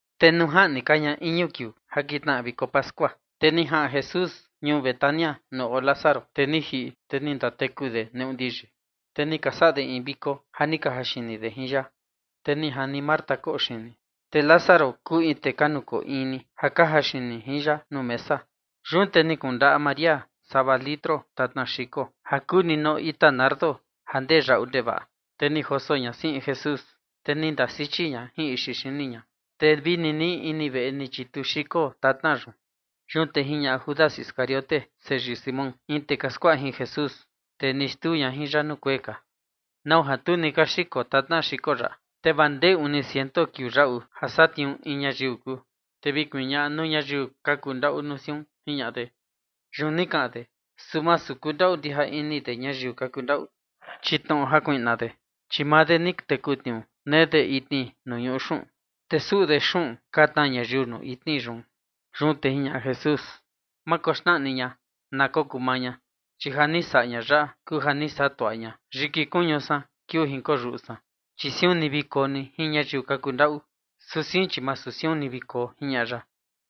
Te nuu jaꞌni ka ña iñu kiuu ja kitnaꞌa viko pascua, te ni jaꞌan Jesús ñuu Betania nuu oo Lázaro, tee ni jiꞌi, te ni ndateku de neꞌu ndiyi. Te ni ka saꞌa de in viko ja ni ka jaxini de jin ya, te ni jani Marta koꞌo xini, te Lázaro kuu in tee ka nukoo in ni ja ka jaxini jin ya nuu mesa. Yun te ni kundaꞌa María sava litro tatna xiko ja kuu ndimaa ita nardo ja ndee yaꞌu ndevaꞌa, te ni joso ña siꞌin Jesús, te ni ndasichi ña jin ixi xini ña, te vi ninii ini veꞌe ni chitu xiko tatna yun. Yun te jiñaꞌa Judas Iscariote, seyii Simón, in tee ka skuaꞌa jin Jesús, tee ni xtuu ña jin ya nuu kuee ka: ―¿Nau ja tu ni ka xiko tatna xiko yaꞌa, te vaa ndee uni ciento kiuu yaꞌu ja satniuu in ñayiu kuu, te vi kuñaꞌa nuu ñayiu ka kundaꞌu nuu siun? ―jiñaꞌa de. Yun ni kaꞌan de, su masu ja kundaꞌu ndija ini de ñayiu ka kundaꞌu, chi chia kuiꞌna de, te maa de ni teku tniuu nee de itni nuu ñuꞌu xuꞌun, te suꞌu de xuꞌun ka tnaa ñayiu nuu itni yun. Yun te jiñaꞌa Jesús: ―Ma koxnaꞌa ni ña, kokuu maa maa ña, chi ja ni saꞌa ña yaꞌa kuu ja ni saꞌa tuaꞌa ña yiki kuñu san kiuu jinkoyuꞌu san. Chi siun ni vi koo ni jin ñayiu ka kundaꞌu. Su sein, chi masu siun ni vi koo ―jiñaꞌa ya.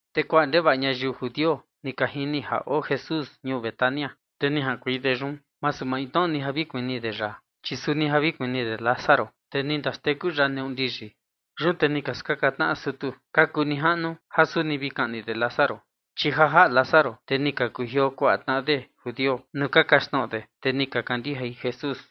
Te kuaꞌa ndevaꞌa ñayiu judio ni ka jini ja oo Jesús ñuu Betania, te ni jaꞌankuei de yun, masu maintnoꞌo ni ja vi kuni de ya, chi suni ja vi kuni de Lázaro, tee ni ndaxteku ya neꞌu ndiyi. Yun te ni ka skaka tnaꞌa sutu ka kuu nijaꞌnu ja suni vi kaꞌni de Lázaro. Chi ja jaꞌa Lázaro, te ni ka kujioo kuaꞌa tnaꞌa de judio nuu ka kaxtnoꞌo de, te ni ka kandijai Jesús.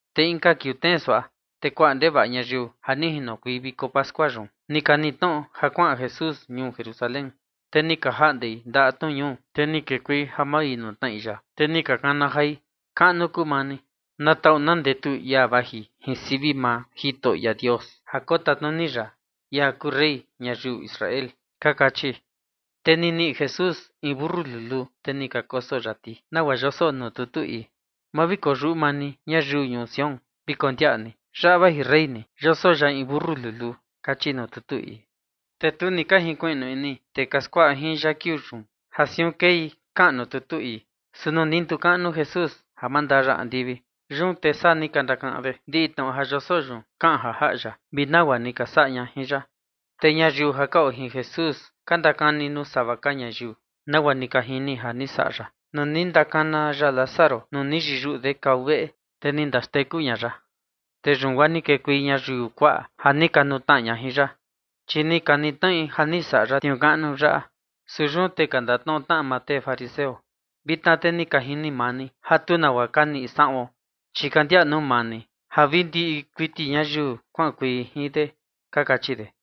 Te inka kiuu tnee suaꞌa, te kuaꞌa ndevaꞌa ñayiu ja ni jinokuei viko pascua yun, ni ka niꞌi tnoꞌo ja kuaꞌan Jesús ñuu Jerusalén. Te ni ka jaꞌndei ndaꞌa tnu ñuu, te ni kekuei ja mavinutnaꞌi ya. Te ni ka kana jai: ―¡Kaꞌnu kuu maa ni! Na taꞌu na ndetu ia vaji jin sivi maa Jitoꞌo Dios ja kotatnuni ya, ia kuu rey ñayiu Israel ―ka kachi. Te ni niꞌi Jesús in mentu luluu, te ni ka koso ya ti, nagua yoso nuu tutu ii: Ma vi koyuꞌu maa ni ñayiu ñuu Sión. Vi kondiaꞌa ni yaꞌa vaji rey ni, Yoso ya in mentu luluu kachi nuu tutu ii. Te tu ni ka jinkuiꞌnu ini tee ka skuaꞌa jin ya kiuu yun ja siun kei kaꞌan nuu tutu ii, su nuu ni ndukaꞌnu Jesús ja mandaa ya andivi, yun te saa ni ka ndakaꞌan de ja ndiꞌi tnoꞌo ja yoso yun kaꞌan ja jaꞌa ya, vi nagua ni ka saꞌa ña jin ya. Te ñayiu ja ka oo jin Jesús ka ndakani nuu sava ka ñayiu nagua ni ka jini ni saꞌa ya, nuu ni ndakana ya Lázaro nuu ni yiyuꞌu de kava veꞌe, te ni ndaxteku ña ya. Te yun guaa ni kekuei ñayiu kuaꞌa ja ni ka nutnaꞌa ña jin ya, chi ni ka niꞌi tnoꞌi ja ni saꞌa ya tniuu kaꞌnu yaꞌa. Su yun te ka ndatnoꞌo tnaꞌa maa tee fariseo: ―Vitna te ni ka jini maa ni ja tu nagua ka niꞌi saꞌuon. Chi ka ndiaꞌa nuu maa ni ja vi ndiꞌi kuiti ñayiu kuaꞌankuei jin de ―ka kachi de.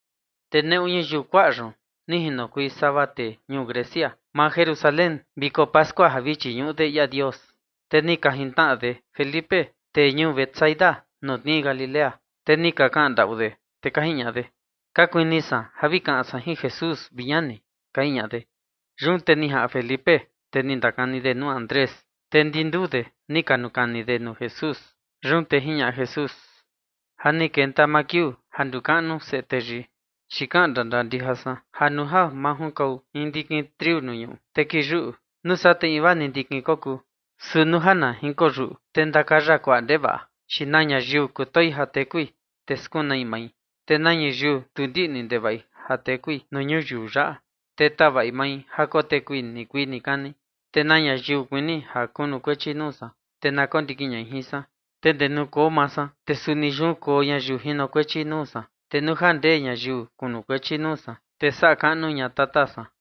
Te neꞌu ñayiu kuaꞌa yun ni jinokuei sava tee ñuu Grecia maa Jerusalén viko pascua ja vi chiñuꞌu de ia Dios. Te ni ka jintnaꞌa de Felipe, tee ñuu Betsaida, ja tnii Galilea, te ni ka kaꞌan ndaꞌu de, te ka jiñaꞌa de: ―Ka kuini san ja vi kaꞌan san jin Jesús, vi ñani ―ka jiñaꞌa de. Yun te ni jaꞌan Felipe, te ni ndakani de nuu Andrés, te ndi nduu de ni ka nukani nuu Jesús. Yun te jiñaꞌa Jesús: ―Ja ni kenta maa kiuu ja ndukaꞌnu Seꞌe Teyii. Chi kaꞌan ndandaa ndija san ja nuu ja ma junkau in ndikin triu nuu ñuꞌu, te kiyuꞌu, nuu saa te invaa ni ndikin kokuu, su nuu ja na jinkiyuꞌu, te ndee ja ndakaya kuaꞌa ndevaꞌa. Chi na ñayiu kutoi ja tekui, te skunai mai, te na ñayiu tu ndiꞌni ndevaꞌi ja tekui nuu ñuyiu yaꞌa, te tavaꞌi mai ja kotekui nikuii nikani. Te na ñayiu kuini ja kunukuechi nuu san, te na kondikin ñai jin san. Te ndee nuu koo maa san, te suni yun koo ñayiu jinokuechi nuu san. Te nuu ja ndee ñayiu kunukuechi nuu san, te saꞌa kaꞌnu ña Tata san.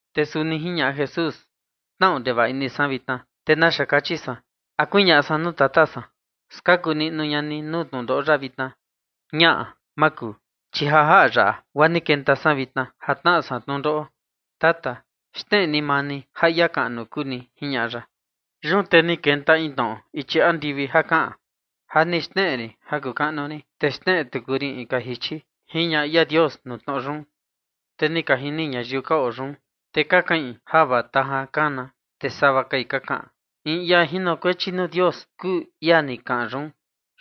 Te suni jiñaꞌa Jesús: ―Tnaꞌu ndevaꞌa ini san vitna, ¿te naxa kaꞌan san? ¿A kuñaꞌa san nuu Tata san: “Skaku niꞌnu ña ni nuu tnundoꞌo yaꞌa vitna”? Ñaꞌa, ma kuu, chi ja jaꞌa yaꞌa guaa ni kenta san vitna ja tnaꞌa san tnundoꞌo. Tata, xneꞌe ni maa ni ja ia kaꞌnu kuu ni ―jiñaꞌa ya. Yun te ni kenta in tnoꞌo ichi andivi ja kaꞌan: ―Ja ni xneꞌe rin ja kuu kaꞌnu rin, te xneꞌe tuku rin inka jichi ―jiñaꞌa ia Dios nuu tnoꞌo yun. Te ni ka jini ñayiu ka oo yun, te ka kaꞌin ja vaa tajan kana, te sava kai ka kaꞌan: ―In ia jinokuechi nuu Dios kuu ia ni kaꞌan yun.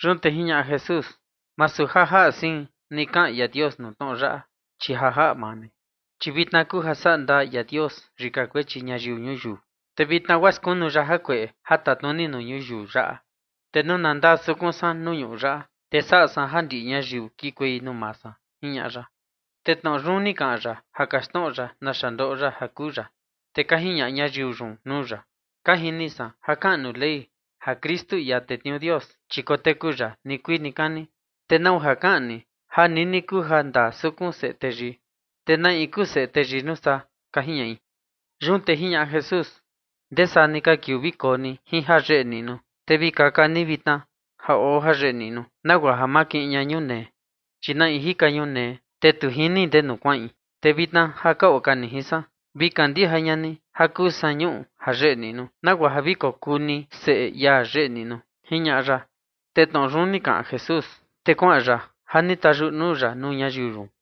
Yun te jiñaꞌa Jesús: ―Masu ja jaꞌa sein ni kaꞌan ia Dios nuu tnoꞌo yaꞌa, chi ja jaꞌa maa ni. Chi vitna kuu ja saꞌa ndaa ia Dios yika kuechi ñayiu ñuyiu. Te vitna guaa skunu ya jakueꞌe ja tatnuni nuu ñuyiu yaꞌa. Te nuu na ndakoo sukun san nuu ñuꞌu yaꞌa, te saꞌa san ja ndiꞌi ñayiu kikuei nuu maa san ―jiñaꞌa ya. Te tnoꞌo yun ni kaꞌan ya ja kaxtnoꞌo ya naxa ndoꞌo ya ja kuu ya. Te ka jiñaꞌa ñayiu yun nuu ya: ―Ka jini san ja kaꞌan nuu Ley, ja Kristu, ia tetniuu Dios, chi koteku ya nikuii nikani. ¿Te nau ja kaꞌan ni ja nini kuu ja ndakoo sukun Seꞌe Teyii? ¿Te na in kuu Seꞌe Teyii yun nuu saa? ―ka jiñaꞌi. Yun te jiñaꞌa Jesús: ―Ndee saa ni ka kiuu vi koo ni jin ñuꞌu ja yeꞌe niꞌnu. Te vi kaka ni vitna ja oo ñuꞌu ja yeꞌe niꞌnu, nagua ja ma kiꞌin ña ñunee. Chi na in jika ñunee, te tu jini ndenu kuaꞌin. Te vitna ja ka oo ka ni jin san, vi kandija ña ni ja kuu san ñuꞌu ja yeꞌe niꞌnu, nagua ja vi kokuu ni seꞌe ia yeꞌe niꞌnu ―jiñaꞌa ya. Te tnoꞌo yun ni kaꞌan Jesús, te kuaꞌan ya ja ni tayuꞌu nuu ya nuu ñayiu yun.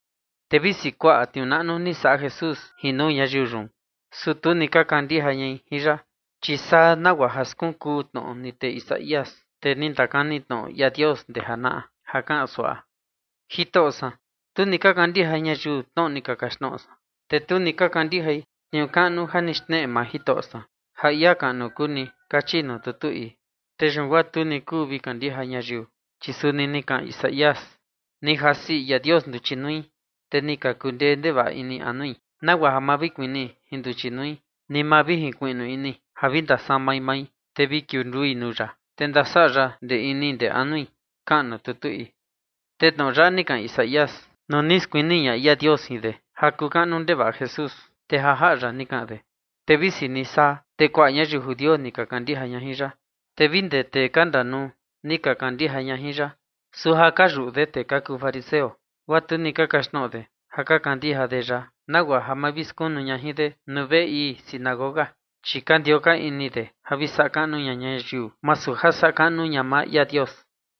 Te visi kuaꞌa tniuu naꞌnu ni saꞌa Jesús jin nuu ñayiu yun, su tu ni ka kandija ñai jin ya. Chi saa suaꞌa nagua ja skunkuu tnoꞌo ni tee Isaías, tee ni ndakani tnoꞌo ia Dios ndee janaꞌa, ja kaꞌan suaꞌa: Jitoꞌo san, tu ni ka kandija ñayiu tnoꞌo ni ka kaxtnoꞌo san, te tu ni ka kandijai tniuu kaꞌnu ja ni xneꞌe maa Jitoꞌo san, ja ia kaꞌnu kuu ni kachi nuu tutu ii. Te yun guaa tu ni kuu vi kandija ñayiu, chi suni ni kaꞌan Isaías: Ni jasi ia Dios nduchi nui, te ni ka kundee ndevaꞌa ini anui, nagua ja ma vi kuni jin nduchi nui, ni ma vi jinkuiꞌnu ini ja vi ndasamai mai, te vi kiundui nuu ya, te ndasaꞌa ya ndee ini ndee anui kaꞌan nuu tutu ii. Te tnoꞌo yaꞌa ni kaꞌan Isaías, nuu ni skuni ña ia Dios jin de ja kuu kaꞌnu ndevaꞌa Jesús, te ja jaꞌa ya ni kaꞌan de. Te visi ni saa, te kuaꞌa ñayiu judio ni ka kandija ña jin ya, te vi guaa ndee tee ka tatnuni ni ka kandija ya. Su ja ka yuꞌu de tee ka kuu fariseo, guaa tu ni ka kaxtnoꞌo de ja ka kandija de ya, nagua ja ma vi skunu ña jin de nuu veꞌe ii sinagoga. Chi ka ndioo ka ini de ja vi saꞌa kaꞌnu ña ñayiu, masu ja saꞌa kaꞌnu ña maa ia Dios.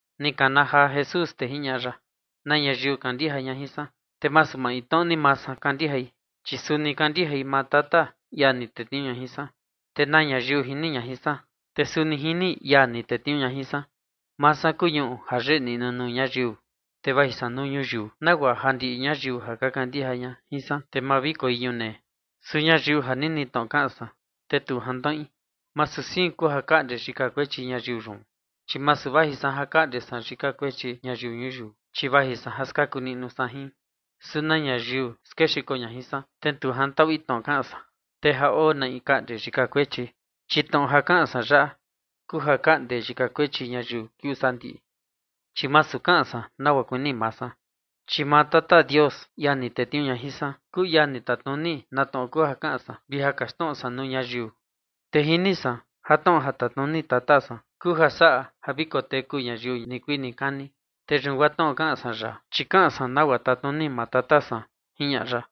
Ni kana jaa Jesús, te jiñaꞌa ya: ―Na ñayiu kandija ña jin san, te masu maintnoꞌo ni maa san kandijai, chi suni kandijai maa Tata, ia ni tetniuu ña jin san. Te na ñayiu jini ña jin san, te suni jini ia ni tetniuu ña jin san. Maa san kuu ñuꞌu ja yeꞌe niꞌnu nuu ñayiu, te vaji san nuu ñuyiu, nagua ja ndiꞌi ñayiu ja ka kandija ña jin san, te ma vi koi ñunee. Su ñayiu ja nini tnoꞌo kaꞌan san, te tu jantnoꞌi, masu sein kuu ja kaꞌnde yika kuechi ñayiu yun, chi masu vaji san ja kaꞌnde san yika kuechi ñayiu ñuyiu, chi vaji san ja skaku niꞌnu san jin. Su na ñayiu skexiko ña jin san, te tu jantaꞌui tnoꞌo kaꞌan san, te ja oo na in kaꞌnde yika kuechi, chi tnoꞌo ja kaꞌan san yaꞌa kuu ja kaꞌnde yika kuechi ñayiu kiuu sandiꞌi. Chi masu kaꞌan san nagua kuini maa san, chi maa Tata Dios, ia ni tetniuu ña jin san, kuu ia ni tatnuni na tnoꞌo kuu ja kaꞌan san, vi ja kaxtnoꞌo san nuu ñayiu. Te jini san ja tnoꞌo ja tatnuni Tata san kuu ja saꞌa ja vi koteku ñayiu nikuii nikani. Te yun guaa tnoꞌo ja kaꞌan san yaꞌa, chi kaꞌan san nagua tatnuni maa Tata san ―jiñaꞌa ya.